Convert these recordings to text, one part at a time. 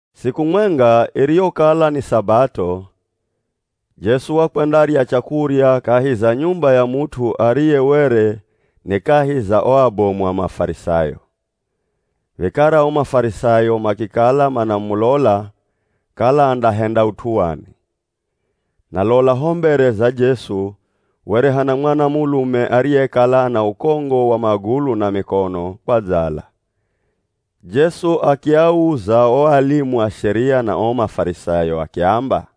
Siku mwenga iriyokala ni Sabato, Jesu wakwendarya chakurya kahi za nyumba ya mut'u ariye were ni kahi za o abomu a Mafarisayo. Vikara o Mafarisayo makikala manamulola kala andahenda ut'u wani. Na lola ho mbere za Jesu were hana mwanamulume ariyekala ana ukongo wa magulu na mikono kwadzala. Jesu akiauza o alimu a Sheria na o Mafarisayo akiamba,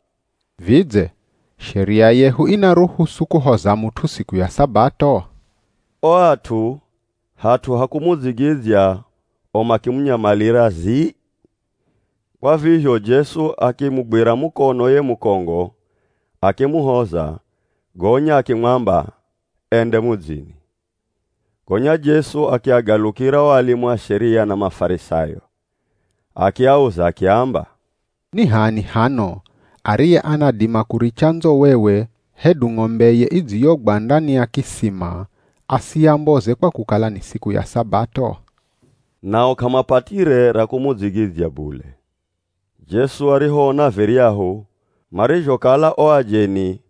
“Vidze Sheria yehu inaruhusu kuhoza mut'u siku ya Sabato?” O at'u hat'u ha kumudzigidzya o makimunyamalira zii. Kwa vizho Jesu akimugwira mukono ye mukongo akimuhoza gonya akimwamba ende mudzini. Gonya Jesu akiagalukira o alimu a Sheria na Mafarisayo, akiauza akiamba, “Ni h'ani hano ariye anadima kuricha ndzowewe hedu ng'ombeye idziyogwa ndani ya kisima asiyamboze kwa kukala ni siku ya Sabato?” Nao k'amapatire ra kumudzigidzya bule. Jesu arihoona viryahu marizhokala o ajeni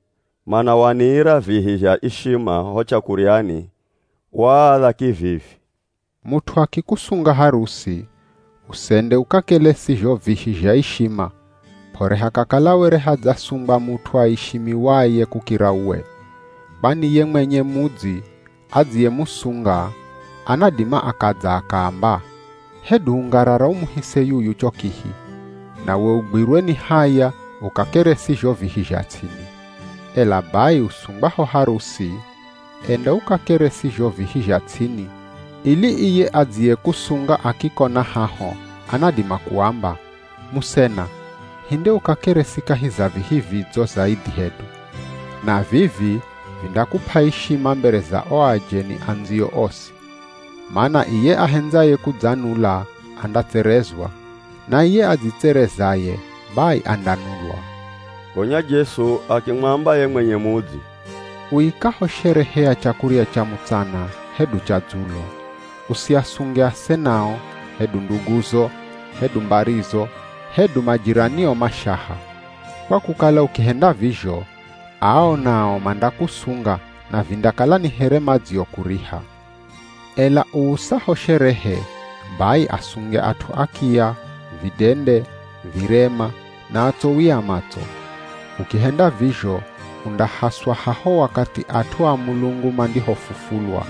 manawaniira vihi zha ishima ho chakuryani, waaadha kivivi, “Mut'u akikusunga harusi, usende ukakelesi zho vihi zha ishima p'ore hakakala were hadzasungwa mut'u aishimiwaye kukira uwe, kwani ye mwenye mudzi adziyemusunga anadima akadza akaamba, ‘Hedu ungarara umuhise yuyu cho kihi,’ nawe ugwirwe ni haya ukakeresi zho vihi zha ts'ini. Ela bai usungwaho harusi, enda ukakeresi zho vihi zha ts'ini ili iye adziyekusunga akikona haho anadima kuamba, ‘Musena, hinde ukakeresi kahi za vihi vidzo zaidhi hedu.’ Na vivi vindakup'a ishima mbere za o ajeni andziyo osi. Mana iye ahendzaye kudzanula andatserezwa, na iye adzitserezaye bai andanulwa.” Gonya Jesu akimwamba ye mwenye mudzi, “Uikaho sherehe ya chakurya cha mutsana hedu cha dzulo, usiasunge asenao, hedu nduguzo, hedu mbarizo, hedu majiranio mashaha, kwa kukala ukihenda vizho, ao nao mandakusunga na vindakala ni here madziokuriha. Ela uusaho sherehe, bai asunge at'u akiya, vidende, virema, na atsowi a matso. Ukihenda vizho undahaswa haho wakathi at'u a Mulungu mandihofufulwa,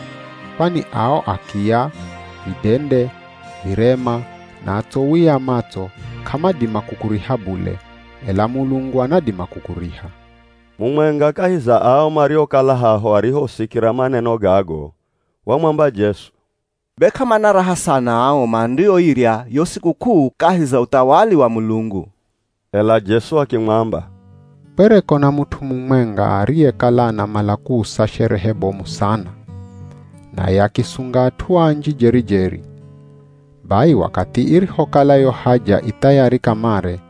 kwani ao akiya, vidende, virema na atsowi a matso k'amadima kukuriha bule, ela Mulungu anadima kukuriha.” Mumwenga kahi za ao mariokala haho arihosikira maneno gago wamwamba Jesu, “Be k'amana raha sana ao mandioirya yo sikuk'uu kahi za uthawali wa Mulungu!” Ela Jesu akimwamba, “Kwereko na mut'u mumwenga ariyekala anamala kuusa sherehe bomu sana, naye akisunga at'u anji jeri-jeri.” Bai wakathi irihokala yo haja i thayari kamare,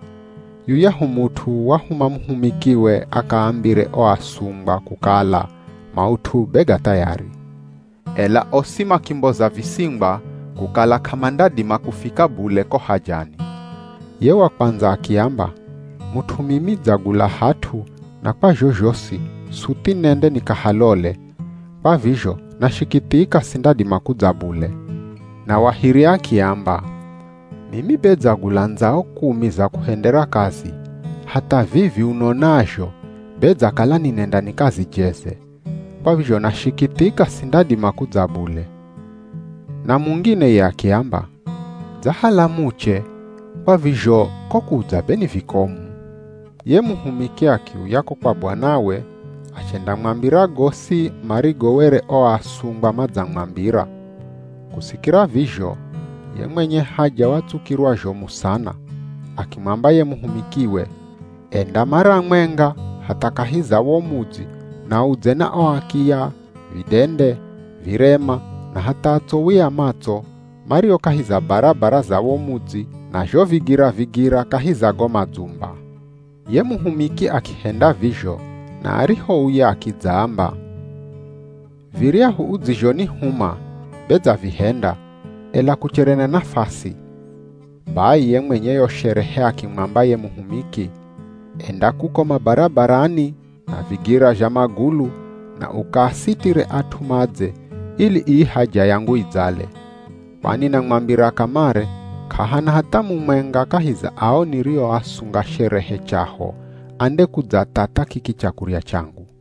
yuyahu mut'u wahuma muhumikiwe akaambire o asungwa kukala maut'u be ga thayari. Ela osi makimboza visingwa kukala k'amandadima kufika bule ko hajani. Ye wa kwandza akiamba, “Mut'u mimi dzagula hat'u na kwa zhozhosi suthi nende nikahalole, kwa vizho nashikithika sindadima kudza bule.” Na wa hiri akiamba, “Mimi be dzagula ndzao kumi za kuhendera kazi hatha vivi unonazho be dzakala ninenda nikazijeze, kwa vizho nashikithika sindadima kudza bule.” Na mungine ye akiamba, “Dzahala muche, kwa vizho ko kudza be ni vikomu.” Ye muhumiki akiuya ko kwa bwanawe achendamwambira gosi marigo were o asungwa madzamwambira. Kusikira vizho, ye mwenye haja watsukirwa zhomu sana, akimwamba ye muhumikiwe, “Enda mara mwenga hatha kahi za wo mudzi na udze na o akiya, vidende, virema na hatha atsowi a matso mario kahi za barabara za wo mudzi na zho vigira-vigira kahi za go madzumba.” Ye muhumiki akihenda vizho na arihouya akidzaamba, “Viryahu udzizhonihuma be dzavihenda, ela kuchere na nafasi.” Bai ye mwenye yo sherehe akimwamba ye muhumiki, “Enda kuko mabarabarani na vigira zha magulu na ukaasitire at'u madze ili ii haja yangu idzale. Kwani namwambira kamare k'ahana hatha mumwenga kahi za ao nirioasunga sherehe chaho andekudzathatha kiki chakurya changu.”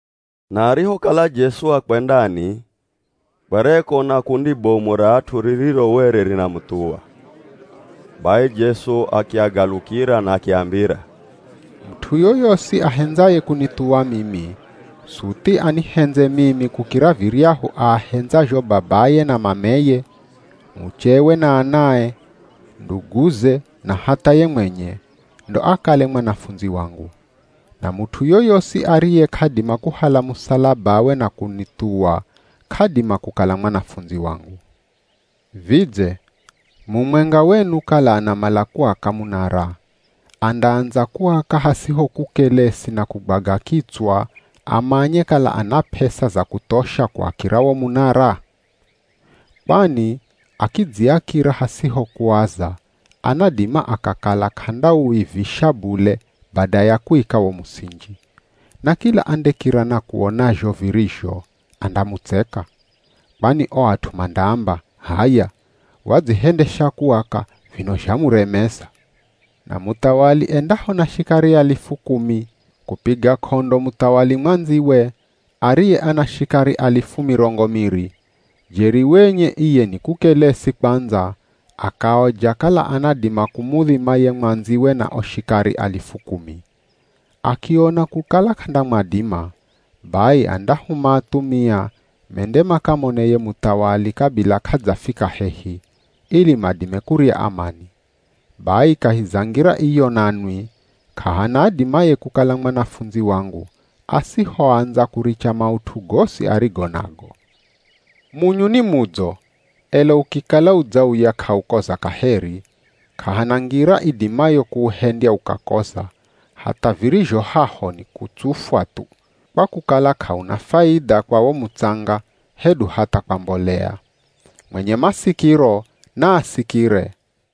Na arihokala Jesu akwendani, kwereko na kundi bomu ra at'u ririro were rinamuthuwa. Bai Jesu akiagalukira na akiambira, “Mut'u yoyosi ahendzaye kunithuwa mimi, suthi anihendze mimi kukira viryahu aahendzazho babaye na mameye, muchewe na anae, nduguze na hatha ye mwenye, ndo akale mwanafundzi wangu. Na mut'u yoyosi ariye k'adima kuhala musalabawe na kunithuwa k'adima kukala mwanafundzi wangu. Vidze, mumwenga wenu kala anamala kuaka munara, andaandza kuaka hasiho kukelesi na kugwaga kitswa amanye kala ana p'esa za kuthosha kuakira wo munara? Kwani akidziakira hasiho kuaza anadima akakala k'andauivisha bule bada ya kuika wo musinji, na kila andekira na kuona zho virizho, andamutseka. Kwani o at'u mandaamba, ‘H'aya, wadzihendesha kuaka vino zhamuremeza.’ Na muthawali endaho na shikari alifu kumi, kupiga k'ondo muthawali mwandziwe ariye ana shikari alifu mirongo miri, jeri wenye iye ni kukelesi kwandza akaoja kala anadima kumudhima ye mwandziwe na o shikari alifu kumi. Akiona kukala k'andamwadima, bai andahuma athumia mende makamone ye muthawali kabila k'adzafika hehi, ili madime kurya amani. Bai kahi za ngira iyo nanwi, k'ahana adimaye kukala mwanafundzi wangu, asihoandza kuricha maut'u gosi arigo nago.” “Munyu ni mudzo, ela ukikala udzauya k'aukoza kaheri, k'ahana ngira idimayo kuuhendya ukakoza, hatha virizho haho ni kutsufwa thu, kwa kukala k'auna faidha kwa wo mutsanga, hedu hatha kwa mbolea. Mwenye masikiro, naasikire.”